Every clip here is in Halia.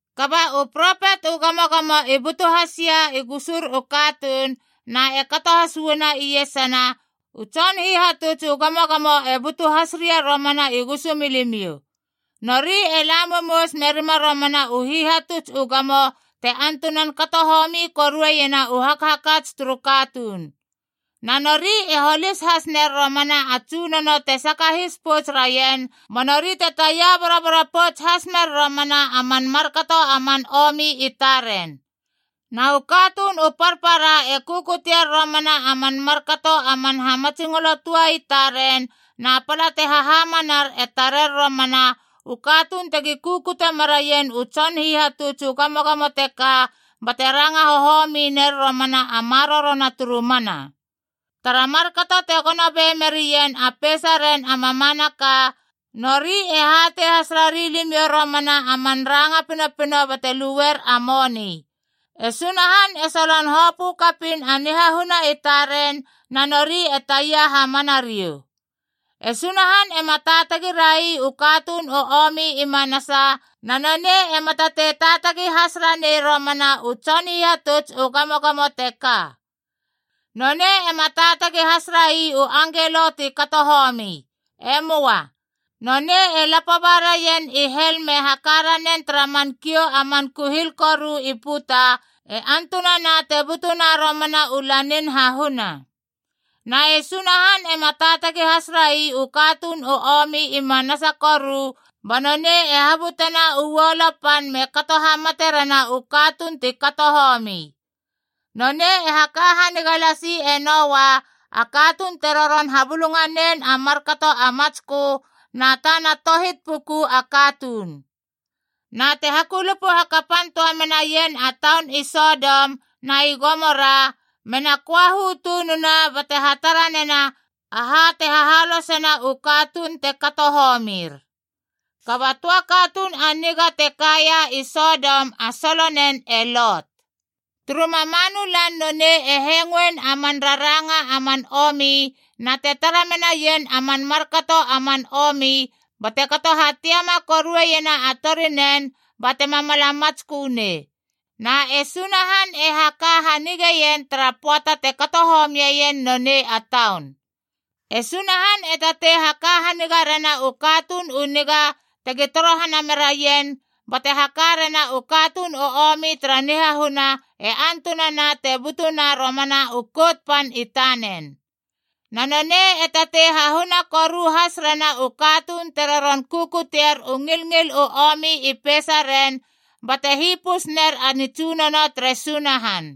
Kaba u propet u gamogamo i butu hasia i gusur u katuun, na e kato has uanou iesana, u tson hihatuts u gamogamo e butu has ria romana i gusumilimiou. Nori e la momous merima romana u hihatuts u gamo te antunan kato homi korueiena u hakhakats turu katuun. Na nori e holis has ner romana a Tsunono te sakahis pouts raien, ba nori te taia boroboro pouts has mer romana a man markato a man omi i taren. Na u katuun u parpara e kukutier romana a man markato a man hamatsingolo tua i taren, na pala te hahamanar e tarer romana u katuun tegi kukute meraien u tson hihatuts u gamogamo teka bate ranga hohomi ner romana a marorona turu mana. Tara markato te gono be menarien a peisaren a mamanaka, nori e hatei has rari limiou romana a man ranga pinopino bate luer a moni. E Sunahan e solon hopö kapiin a nihahuna i taren, na nori e taia hamana riou. E Sunahan ema taatagi rai u katuun u omi i manasa, na nonei ema tatei taatagi has ranei romana u tson hihatuts u gamogamo teka. Nonei ema taatagi has rai u angelo ti kato homi. E möa. Nonei e lapo ba raien i hel me haka ranen tara man kiou a man kuhil koru i puta e antunana te butuna romana u lanin hahuna. Na e Sunahan ema taatagi has rai u katuun u omi i manasa koru, ba nonei e habutena uolo pan me kato hamate rena u katuun ti kato homi. Nonei e haka haniga lasi e Noa, a katuun te roron habulunganen a markato a matskö, na tana tohit puku a katuun. Na te hakulupu hakapan töa menaien a taun i Sodom na i Gomora mena köahu tununa bate hatara nena aha te hahalosena u katuun te kato homir. Kaba a töa katuun a niga te kaia i Sodom a solonen e Lot. Turu mamanu lan nonei e hengoen a man raranga a man omi na te tara menaien a man markato a man omi bate kato hatiama korueiena a torinen batema mala matskö nei. Na e Sunahan e haka hanigeien tara pöata te kato homieien nonei a taun. E Sunahan e tatei haka haniga rena u katuun u niga tegi torohana meraien, bate haka rena u katuun u omi tara nihahuna e antunana te butuna romana u Kout Pan i tanen. Na nonei e tatei hahuna koru has rena u katuun te roron kukuteier u ngilngil u omi i peisaren, bate hipus ner a nitsunono tere Sunahan.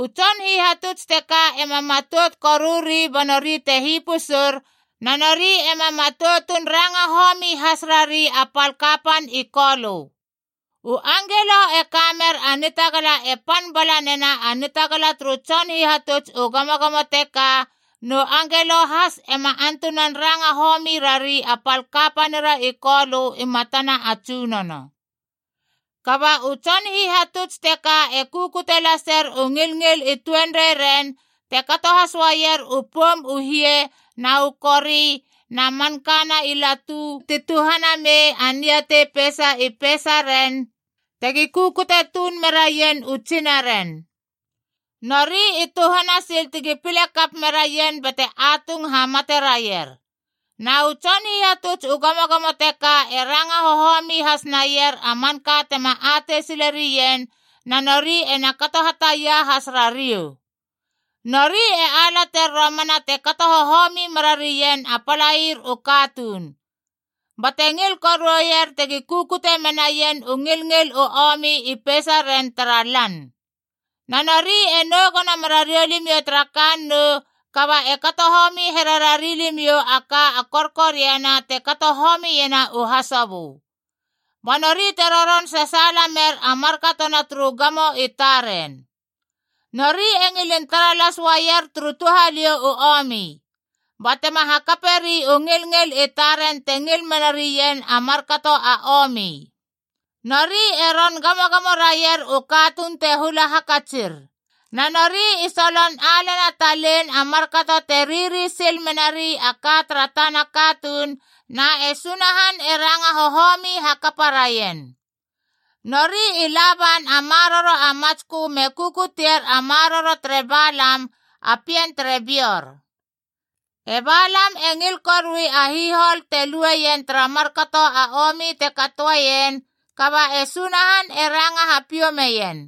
U tson hihatuts teka ema matout koruri ba nori te hipusur, na nori ema matoutun ranga homi has rari a pal kapan i Kolö. U angelo e ka mer a nitagala e pan bala nena a nitagala turu tson hihatuts u gamogamo teka, nu angelo has ema antunan ranga homi rari a pal kapanira i Kolö i matana a Tsunono. Kaba u tson hihatuts teka e kukute laser u ngilngil i tuenreiren, te kato has uaier u poum u hie na u kori na mankana i latu ti tuhana mei a niatei peisa i peisaren tegi kukute tuun meraien u tsinaren. Nori i tuhana sil tegi pile kap meraien bate atung hamate raier. Na u tson hihatuts u gamogamo teka e ranga hohomi has naier a manka tema atei sile rien, na nori ena kato hataia has rariou. Nori e alater romana te kato hohomi merarien a palair u katuun. Bate ngil koruer tegi kukute menaien u ngilngil u omi i peisaren tara lan. Na nori e nou gono mera riou limiou tara kannou, kaba e kato homi here rari limiou a ka a korkoriana te kato homiena u hasobö. Ba nori te roron sasaala mer a markatona turu gamo i taren. Nori e ngilin tara las uaier turu touhaliou u omi. Ba tema hakaperi u ngilngil i taren te ngil mena rien a markato a omi. Nori e ron gamogamo raier u katuun te hula hakatsir. Na nori i solon alena talein a markato te riri sil menari a ka tara tana katuun, na e Sunahan e ranga hohomi hakapa raien. Nori i la ban a maroro a matskö me kukutier a maroro tere Balam a pien tere Beor. E Balam e ngil korui a hihol te lueien tara markato a omi te katoeien, kaba e Sunahan e ranga hapiou meien.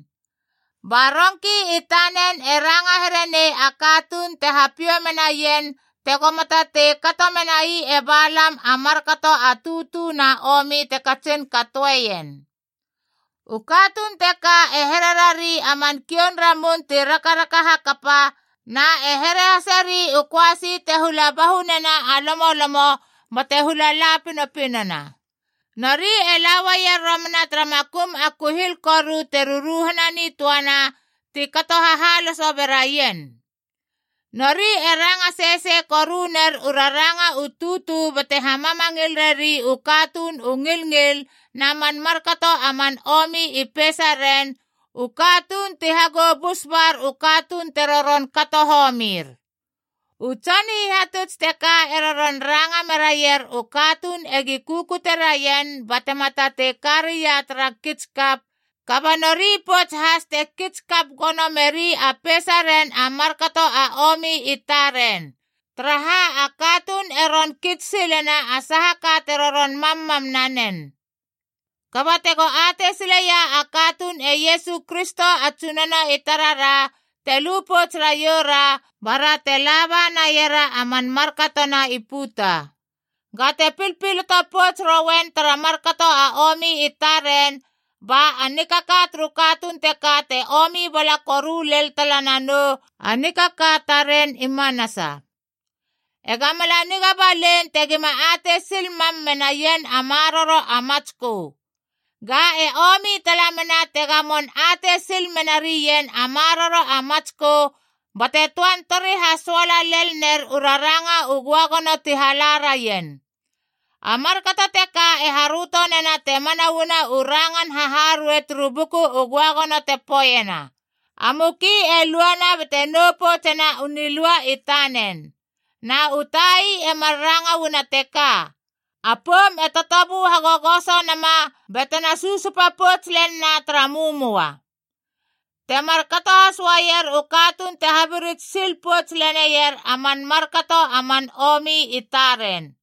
Ba rongki i tanen e ranga here nei a katuun te hapiou menaien tegoma tatei kato menai e Balam a markato a tutu na omi te katsin katoeien. U katuun teka e hererari a man kioun ramun ti rakaraka hakapa, na e here haseri u köasi te hula bahu nena a lomolomo bate hula la pinopinona. Nori e la uaier romana tara makum a kuhil koru te ruruhana nitöana, ti kato hahaloso beraien. Nori e ranga sesei koru ner u raranga u tutu bate hamamangil reri u katuun u ngilngil na man markato a man omi i peisaren, u katuun ti hagou bus bar u katuun te roron kato homir. U tson hihatuts teka e roron ranga meraier u katuun egi kukute raien batema tatei karia tara kits kap, kaba nori pouts has te kits kap gono meri a peisa ren a markato a omi i taren. Taraha, a katuun e ron kits silena a saha ka te roron mammam nanen. Kaba tego atei sileia a katuun e Iesu Kristo a Tsunono i tarara, te lu pouts raiou ra, bara te laba naiera a man markatona i puta. Ga te pilpiloto pouts roien tara markato a omi i taren, ba a nikaka turu katuun teka te omi bala koru lel tala nanou a nikaka taren i manasa. Ega mala niga balein tegima atei sil mam menaien a maroro a matskö. Ga e omi tala mena te gamon atei sil mena rien a maroro a matskö bate töan tori hasoala lel ner u raranga u göagono ti hala raien. A markato teka e haröto nena te mana uana u rangan haharuei turu Buku u Göagono te poeiena, “A muki e luana bate nou poutsena u nilua i tanen.” Na u tai e mar ranga uana teka, “A poum e totobu hagogoso nama batena susupa pouts len na tara mömoa.” Te markato has uaier u katuun te habirits sil pouts leneier a man markato a man omi i taren.